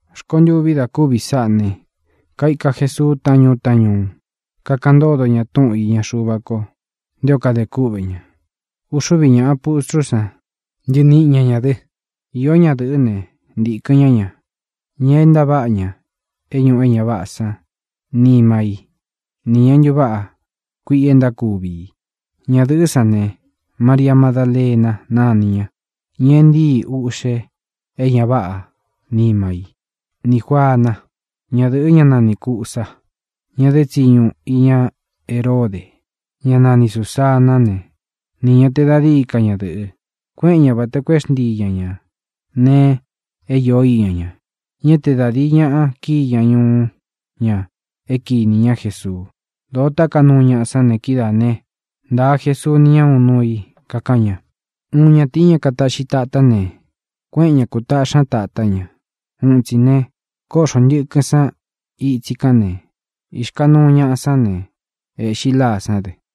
Rkontûví da kúvi sáꞌā ne, kaika Jesuu taꞌán ñuu taꞌán ñuu, kakaꞌan ntódo ñā túꞌun īña Xuva ko nté o kadē kúꞌvē ña. Uxúvi ñāꞌa pustrú san ntɨniꞌi ña ñā dɨ. Īó ñadɨ̄ꞌɨ́ ne, ntikɨ̄n ñá ña, ña é ntaváꞌa ña é ñūꞌu é ña váꞌā san nima í nī ña é ntuváꞌa kuiꞌi e ntákuvi i. Ñadɨ̄ꞌɨ́ san ne: María Madalena nani ña, ña e ntíi uꞌxe é ña váꞌā nima í, nī Juana, ñádɨ̄ꞌɨ ñá nani Cūsa, ña dé tsiñu iña Heródē; ñá nani Sūsaná ne, nī ña te da díi ka ñadɨ̄ꞌɨ, kueꞌen ñá vata koo é xntii ña ña nēe é īó iña ña. Ñá te da dīi ñaꞌa kíi ña ñuú ña é kinī ñá Jesuu. Dōo táka nuu ñaꞌa sán ne, kidáa ne, ntāa Jesuu ni ña uun nuu i, kakaꞌan ña: —Uun ñatīí, ña kataꞌxi tatá ne, kuéꞌen ña kūtaꞌxí ña tatá ña. Uun itsi ne, kóꞌxo ntɨ̄kɨn san itsi kán ne, ixkanúu ñaꞌa sán ne, ēꞌxi láa sán dɨ.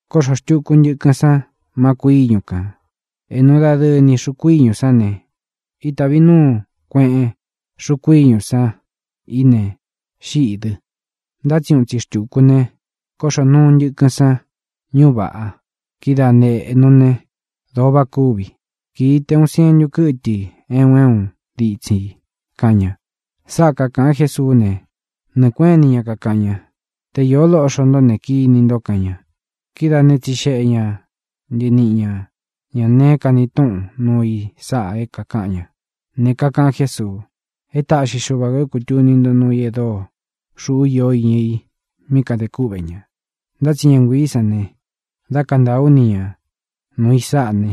Kóꞌxō xtuku ntɨkɨn san má kūꞌu íñu kān. Ēꞌnu dadɨɨ ni xuku íñū sán ne, ítāvi núu kueꞌen xúku íñū san i ne, xíꞌī dɨ. Ntá tsi uun itsi xtuku ne, kóꞌxō nuu ntɨkɨn san ñúꞌu vāꞌa. Kidáa ne, ēꞌnu né, dōo váꞌa kúvi. Kīi te uun sientu kɨ́tɨ i é un é un ditsin i —kaꞌan ña. Sáꞌa kākaꞌan Jésuú ne, nɨɨ̄ kuéꞌen ini ña kakaꞌan ña: —¡Te īó loꞌxo ntó ne, kini nto! —kaꞌan ña. Kidáā né, tsixeꞌe ña ntɨniꞌi ña ñā neé kani túꞌun nuu i sáꞌa é kākaꞌan ña. Ne, kakaꞌan Jésuu: —É taꞌxi Xuva kō é kūtuni ntó nuu i e dóo xūꞌú iō iña i mí kadē kúꞌvē ña. Ntá tsi ña nguiī sán ne, da kantaa ú ni ñā nuu i sáꞌa ne,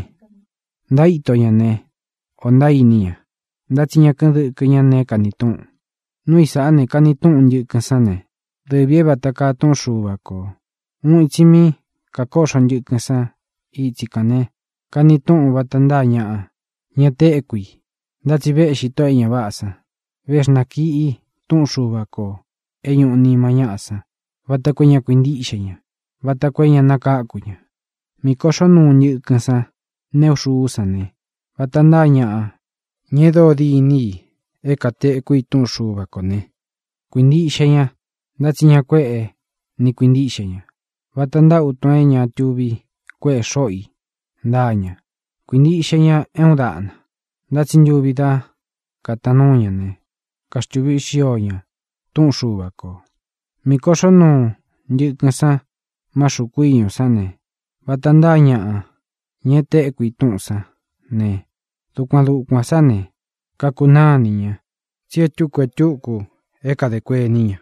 ntaíto ña ne, ō ntaíni ña, ntá tsi ña kɨ́ꞌɨn dɨkɨ ña neé kani túꞌun. ʼNuu i sáꞌā ne, kani túꞌun: Ntɨ̄kɨ́n san ne, dɨvī é vata kaa túꞌun Xuva kō. Uun itsi mí kakóꞌxo ntɨkɨn san itsi kán ne, kani túꞌun vata ntáa ñaꞌa, ña téku i, ntá tsi véꞌxi tóꞌō e ña váꞌā san, véxnakiꞌi túꞌun Xuva kō é ñuꞌu nima ñáꞌa san vata koo é ña kuintíꞌxe ña, vata koo é ña nakáku ña. Mī koꞌxó nuu ntɨkɨn san neꞌu xuú san ne, vata ntáa ñaꞌa, ña e dóo dîní i é kātekú i túꞌun Xuva kō ne, kuīntiꞌxe ña, ntá tsi ña kuéꞌe ni kuīntiꞌxe ña. Vata ntáa utun é ña tuvi kuéꞌe xóꞌo i ntáa ña. Kuīntiꞌxe ña é uun daꞌna. Ntá tsi ntuvi dá kātaan núu ña ne, kaxtuví xio ña túꞌun Xuva kō. Mī koꞌxó nuu ntɨkɨn san má xūku íñū sán ne, vata ntáa ñaꞌa, ña e téku i túꞌūn sán ne, dukuan dukuān sá ne, kakunáa inī ña. Tsi é tūku e túku é kadē kuení ña: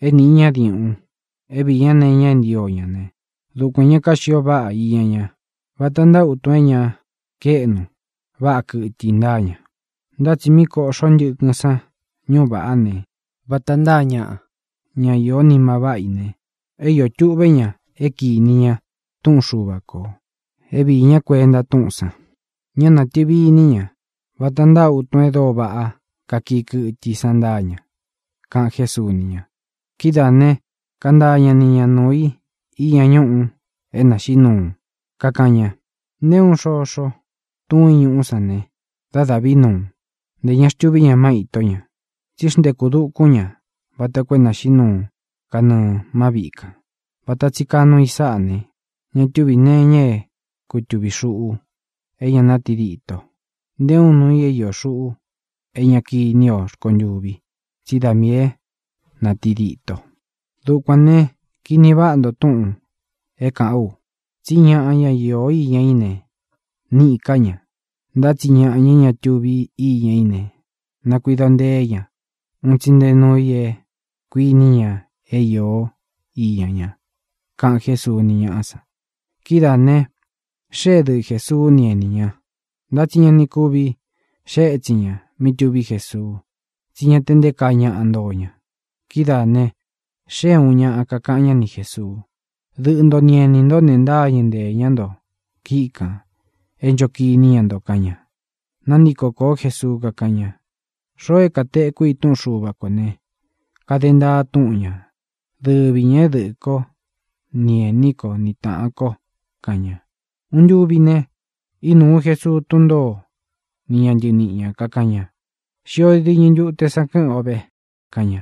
é nīꞌi ñá diuꞌun, é viī ñá nee iña é ntio ña ne, dukuān ña kaxio váꞌa iña ña. Vata ntáa utun é ña kaéꞌnu váꞌa kɨtɨ i ntáa ña. Ntá tsi mí koꞌxo ntɨkɨn sán ñuꞌu vaꞌá ne, vata ntáa ñaꞌa, ñá iō nima váꞌa i ne, é iō tuꞌvé ña é kīni ña túꞌun Xuva kō, é viī ñá kuenta túꞌūn san. Ñá nātɨvi iní ña. Vata ntáa utun e dóo váꞌa kakii kɨtɨ i san ntáa ña —kaꞌan Jésuu ni ña. Kidáā ne, kantaa ña ni ña nuu i iña ñúꞌu é nāxiꞌí nuu, kakaꞌan ña: —Nté uun xoxo tuún i ñuꞌú san ne, dá dāꞌví nuu. Ntē ña xtuví ña má ītó ña. Tsí xnteku dukún ña vata koo é nāxiꞌí nuu kanɨɨ̄ má viꞌi kān. Vata tsi kaa nuu i sáꞌā ne, ña túvī nee iña é kutuvī xuꞌu é ña nátidito, nté uun nuu i é iō xuꞌu é ña kiní o rkontûvi, tsi dá miī é nātidito. ʼDukuān ne, kini vaꞌá nto túꞌūn é kāꞌán u, tsí ñaꞌa, ñá iō iña í ne, níꞌī ká ña. Ntá tsi ña é ña tuvi íña í ne, nakuido nteé ña un tsi nté nuu i é kuini ña é īo íña ña —kaꞌan Jésuu ni ñaꞌá san. Kidáā ne, xée dɨꞌɨ Jēsuu ni ení ña. Ntá tsi ña ni kuvi xée ētsin ña mí tuví Jesuu, tsí ña te nté kaa ñaꞌa ntoo ña. Kidáā ne, xée ūun ñaꞌa, kakaꞌan ñá ni Jēsuu: —Dɨꞌɨ nto ni enī ntó ne, ntáñɨ̄ ntée ña nto kíꞌi kān é ncho kiní ña nto —kaꞌan ña. Nantíko kōó Jesuu, kakáꞌan ña: —Xoo é katekú i túꞌun Xuva kō ne, kade ntaa túꞌun ñā, dɨvi ñā é dɨꞌɨ̄ kó ni ēní ko ni tāꞌan ko —kaꞌan ña. Uun ntuvi ne, ínuu Jesuu tún ntōó ni ña ntɨniꞌi ñā, kakaꞌan ña: —Xio diñɨ ntute san kɨ́ꞌɨn ō ve —kaꞌan ña.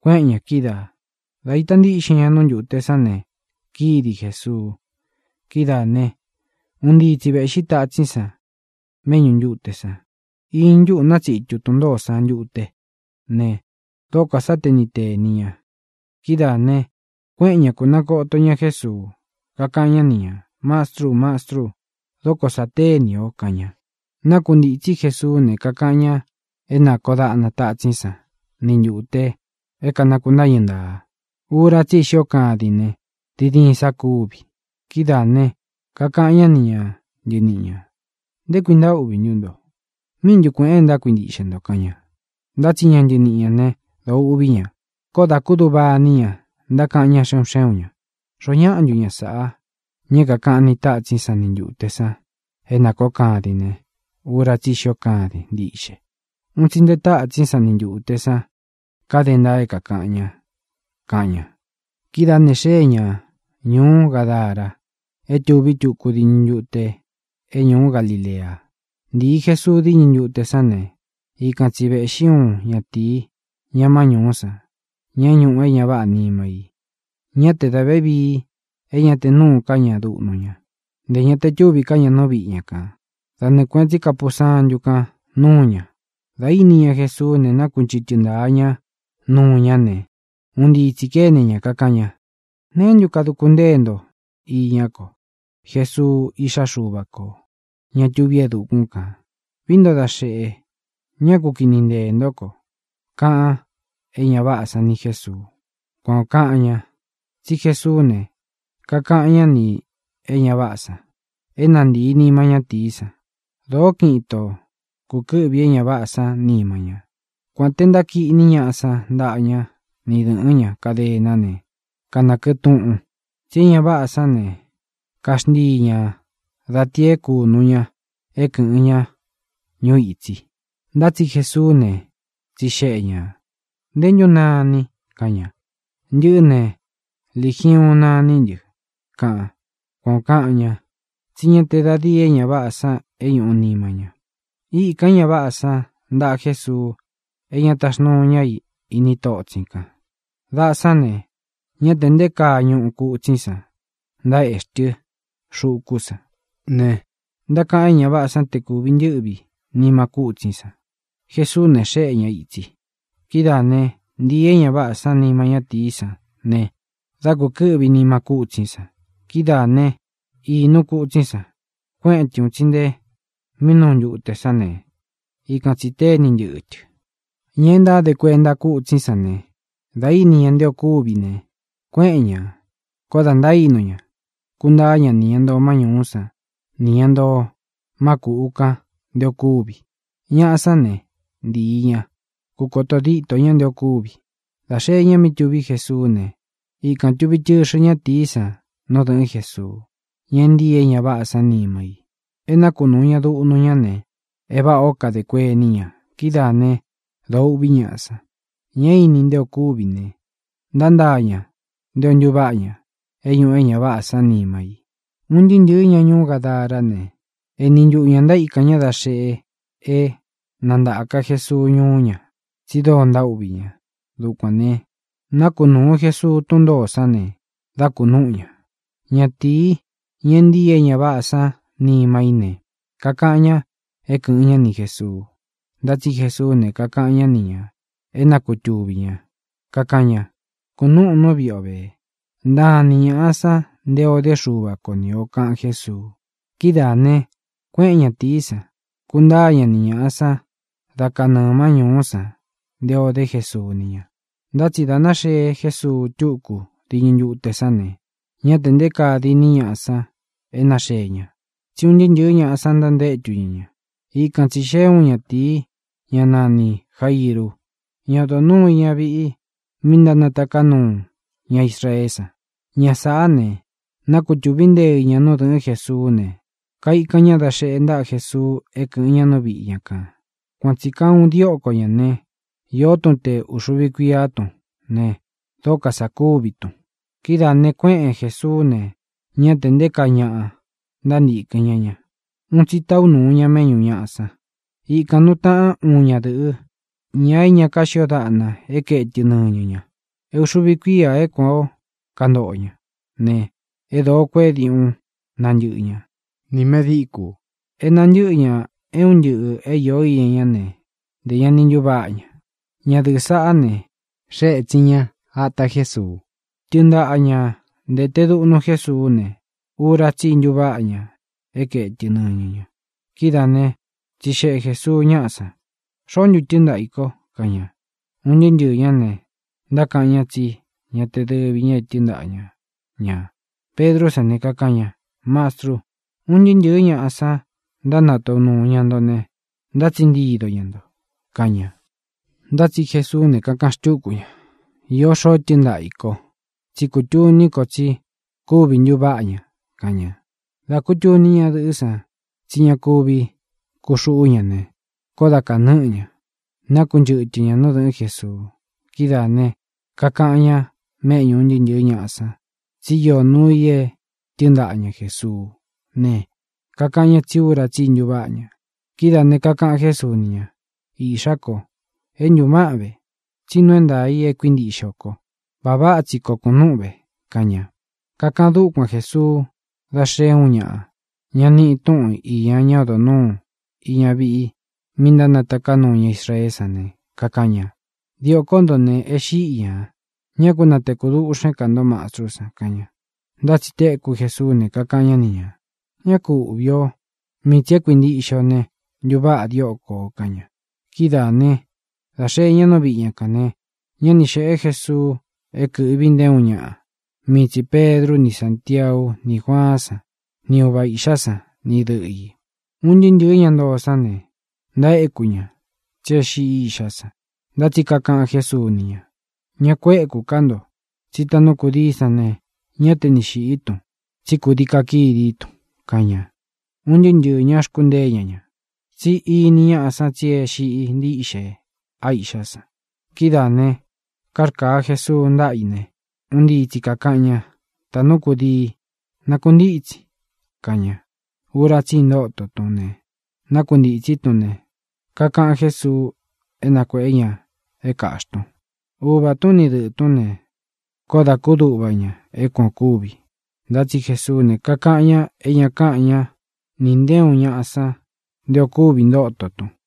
Kuéꞌen ñā kídaā. Da ntaíta ntiꞌxin ña nu ntuté san ne, kídi Jēsuu. Kidáā ne, un ntii tsi vēꞌxí tatsín san méꞌñū ntute san. Iñɨ ntúꞌu nátsitu tun ntōó san ntute ne, dókō sá ni tēni ña. Kidáā ne, kuéꞌen ña kūnantoto ña Jésuu, kakaꞌan ñá ni ñā: —¡Mastru! ¡Mastru! ¡Dóko sā téni ō! —kaꞌan ña. Nákuntītsí Jesuú ne, kakaꞌan ña é nākoó daꞌna tātsín san ni ntūte é kānakuntáñɨ ntaa. Ura tsí i xío kadin ne, diin diin sa kúvi. Kidáā ne, kakaꞌan ñá ni ña ntɨniꞌi ñā: —¿Nté kui ntaúꞌvī ntú nto? ¿Míꞌi ntu kuēꞌen é ntákuintiꞌxe nto? —kaꞌan ña. Ntá tsi ña ntɨniꞌi ñā né, dōo uꞌví ña. Koó dā kúduꞌva ini ña, ntákaꞌan ñá xe un xé un ñā: —¿Xoó ñaꞌa ntu ña sāꞌa, ña é kākaꞌan ni tátsín san ni ntūte san é nākoó kadin ne, ura tsí i xío kadin ntiꞌxe? ¡Un tsi nte tátsín san ni ntūte san kade ntaa é kākaꞌan ña! —kaꞌan ña. Kidáā ne, xée ña ñūú Gadara é tuví tuku diñɨ ntute é ñūú Galilea. Ntii Jesuu díñɨ ntute sán ne, ikan tsi vēꞌxí uun ñatīi, ña má ñūú san, ña é ñūꞌu é ña váꞌā nima i. Ñá te dā vévii é ña te núū ká ña duꞌnu ña; ntē ña te túvī ká ña nú viꞌi ña kān. Da nɨɨ kuēꞌen tsí kapusantu kán nuu ña. Dā íni ña Jesuú ne, nákunchɨ̄tɨ́ ntaa ñá nuu ñá ne, un ntii tsī kéne ña, kakaꞌan ña: —¿Neé ntu kaduku ntée nto iñá ko, Jesuu, iꞌxá Xuva kō, ña tuví e dukún kān? ¡Vií nto da xeꞌe, ñá ku kini nteē ntó ko! —kaꞌan é ña váꞌā san ni Jésuu. Kuan ō kaꞌan ña, tsí Jesuú ne, kakaꞌan ñá nī é ña váꞌā san é na ntīi nima ñátīí san. Dōó kiꞌin ito kūkɨ́ꞌvi é ña váꞌā san nima ñá, kuān te ntákiꞌní ñaꞌa san ntaꞌa ña ni dɨ̄ꞌɨ́n ña kadená ne, kanakɨꞌɨ tuꞌun, tsí e ña váꞌā sán ne, kaxntíi ña da tī é kūnu ña é kɨ̄ꞌɨn ña ñuu itsi. Ntá tsi Jesuú ne, tsixeꞌe ñā: —¿Ntē ntú nanin? —kaꞌan ña. —Ntɨꞌɨ́ ne, Ligiuun naní ntɨ —kaꞌan. Kuan ō kaꞌan ña, tsí ña te da díi e ña váꞌā san é ñūꞌu níma ña. Íkān é ña váꞌā san ntaꞌa Jésuu é ña taxnuu ña í ini totsin kan. Daꞌa san ne, ñá tē nté kaa ñuꞌu kutsín san ntaéꞌxí tɨ xuku san ne, ntákaꞌan é ña váꞌā san te kūvi ntɨ́ꞌvi nima kútsín san. Jesuú ne, xéꞌe ña ītsi. Kidáā ne, ntīi é ña váꞌā san nima ñátīí san ne, dā kukɨ́ꞌvi nima kútsín san. Kidáā né, īnu kutsín san, kueꞌen tɨ un tsi nte mí nuu ntute san ne, ikan tsī téni ntɨꞌɨ tɨ. Ña e ntáde kuenta kútsín san ne, dā íni ña nte o kúvi ne, kuéꞌen ñā, koo da ntaínu ña, kuntaá ña nī ña ntoo má ñūú san nī ña ntoo má kūꞌu kan nté ō kúvi. Ñaꞌa sán ne, ntīi ña, kukoto dîtó ña nté ō kúvi. Dā xee ña mí tuví Jesuú ne, ikān tuvi tɨxɨ ñátīí san nú dɨ̄ꞌɨ́n Jesuu, ña e ntíi é ña váꞌā san nima i. E nákunūu ña duꞌnu ña ne, e váꞌā ó kadē kuení ña. Kidáā né, dōo uꞌví ñaꞌa san. Ña é īni nte o kúvi ne, ntántaa ña nté ō ntuváꞌa ña é ñūꞌu é ña váꞌā sán nima i. Un ntɨɨ́ ntɨ̄ɨ ña ñuú Gadará ne, eni ntuꞌu ñā ntaíkan ña da xeꞌe é na ntāka Jesuu ñuú ña, tsi dóo ntaúꞌvī ña. Dukuān ne, nákunūu Jesuu tún ntōó san ne, dā kunúꞌu ña. Ñatīí, ña e ntíi é ña váꞌā sán nima í ne, kakaꞌan ña é kɨ̄ꞌɨn ñá ni Jēsuu. Ntá tsi Jesuú ne, kakaꞌan ñá ni ñā é na kutuvī ña. Kakaꞌan ña: —Kunúꞌun nú viꞌi ō ve, ntaan ni ñāꞌa san nté ō dé Xuva ko ni ō —kaꞌan Jésuu. Kidáā ne, kuéꞌen ñatīí san, kuntáa ña ni ñāꞌa san da kánɨɨ̄ má ñūú san nté ō dé Jesuu ni ña. Ntá tsi dā náxee Jésuu túku diñɨ ntute sán ne, ñá tē nté kaa diní ñaꞌa san e náxee ña, tsí un ntɨɨ́ ntɨ̄ɨ́ ñaꞌa san ntantétu ña ña. Ikan tsī xeé uun ñatīi, ñá nanī Jairu, ña odo nūu iña viꞌi mí ntánataká nuu ña Israeé san. Ña sāꞌá ne, nakutuvi nteɨ ñā nú dɨ̄ꞌɨ́n Jesuú ne, kaikan ñá da xeꞌe ntaꞌa Jesuu é kɨꞌɨ̄n ña nú viꞌi ña kān. Kuan tsī kaa uun a dióko ñā né, īó tun te ūxuvi kuiá tun ne, dóko sā kúvi tun. Kidáā ne, kuéꞌen Jesuú ne, ñá tē nté kaa ñaꞌa ntántīkɨn ñá ña. Un tsi taꞌu nuu ña méꞌñu ñāꞌa san. Ikān nuu taꞌán uun ñadɨ̄ꞌɨ, ña é ña kaxio daꞌna é kaetɨ nɨñɨ ña. É uxuvi kuía é kuān ó kantoꞌo ña ne, é dōo kueꞌé diuꞌun nantɨ́ꞌɨ ña nī medíkū. É nantɨ́ꞌɨ ñā é un ntɨꞌɨ̄ é īo íña ña ne, ntē ña ni ntuváꞌa ña. Ñadɨ̄ꞌɨ́ saꞌá ne, xée ētsin ña ata Jésuu. Tɨɨn ntaꞌa ña ntēte duꞌnu Jésuú ne, ura tsí i ntuváꞌa ña é kaetɨ nɨñɨ ña. Kidáā né, tsixeꞌe Jēsuu ñáꞌa san: —¿Xoó ntu tɨ́ɨn ntaꞌa ī ko? —kaꞌan ña. Un ntɨɨ́ ntɨɨ̄ ñá ne, ntákaꞌan ña tsí ña te dɨvi ña e tɨ́ɨn ntaꞌa ña ñā. Pedrú san ne, kakaꞌan ña: —Mastrú, un ntɨɨ́ ntɨ̄ɨ́ ñaꞌa san ntánataꞌu nūu ña nto ne, ntátsiꞌi ntido ña nto —kaꞌan ña. Ntá tsi Jesuú ne, kakaꞌan xtúku ña: —Īó xoo tɨ́ɨn ntaꞌa ī ko. Tsí kutuní ko tsí kúvi ntuváꞌa ña —kaꞌan ña. Dā kutuní ñadɨ̄ꞌɨ́ san tsí ña kuvi kuxuꞌú ña ne, koó da kānɨ́ꞌɨ ñā, nakunchɨ́tɨ ña nú dɨ̄ꞌɨ́n Jesuu. Kidáā ne, kakaꞌan ña méꞌñū un ntɨɨ́ ntɨ̄ɨ́ ñaꞌa san tsí iō nuu i é tɨɨn ntaꞌa ña Jēsuú ne, kakaꞌan ña tsí ura tsi ntuváꞌa ña. Kidáā ne, kakaꞌan Jésuu ni ña: —Iꞌxá ko, é ntuváꞌan ve, tsí nuu é ntaā i e kuíntiꞌxe o ko. Vāꞌa váꞌa tsi koo kunúꞌun ve —kaꞌan ña. Kakaꞌan dúkuan Jēsuu dá xēe uun ñaꞌa, ñá nīꞌi túꞌūn iña ñá odo nūu íña viꞌi mí ntánataká nuu ña Israeé san ne, kakaꞌan ña: —Diōkó nto ne, e xíꞌi ñā. Ñá ku nāteku duꞌxén ka nto mastrú san —kaꞌan ña. Ntá tsi téku Jēsuú ne, kakaꞌan ñá ni ñā: —Ñá ku uꞌvī o. Mii tsī é kuintiꞌxe o ne, ntuváꞌa dióko ō —kaꞌan ña. Kidáā né, dā xee ña nú viꞌi ña kān ne, ñá ni xēꞌé Jesuu é kɨ̄ꞌvi nté uun ñaꞌa; mii tsī Pedru ni Sántiau ni Juaán san, ni uva īꞌxá san ni dɨꞌɨ̄ i. Un ntɨɨ́ ntɨɨ̄ ñá ntoo sán ne, ntaéku ña, tsi é xiꞌi iꞌxá san. Ntá tsi kakaꞌan Jésuu ni ña: —Ña kuéku ká nto, tsi táꞌnu kūdií san ne, ñá te ni xīꞌí tun, tsí kūdii kakidí tun —kaꞌan ña. Un ntɨɨ́ ntɨɨ̄ ñá xkuntée ña ña, tsi íni ñāꞌa san tsi é xiꞌi ntíꞌxe a iꞌxá san. Kidáā ne, kárkāa Jesuu ntaꞌa i ne, un ntii tsi kākaꞌan ña: —¡Tāꞌnú kudii, nakuntítsin! —kaꞌan ña. Ura tsí i ntóto tún ne, nákuntītsí tun ne, kakaꞌan Jésuú é na kuēꞌé ña é kāꞌxí tun. Uvā tún ni dɨꞌɨ̄ tún ne, koó dā kúduꞌva ña é kuan ō kúvi. Ntá tsi Jesuú ne, kakaꞌan ña é ña káꞌan ñá nī nté uun ñaꞌa san nté ō kúvi ntóto tun.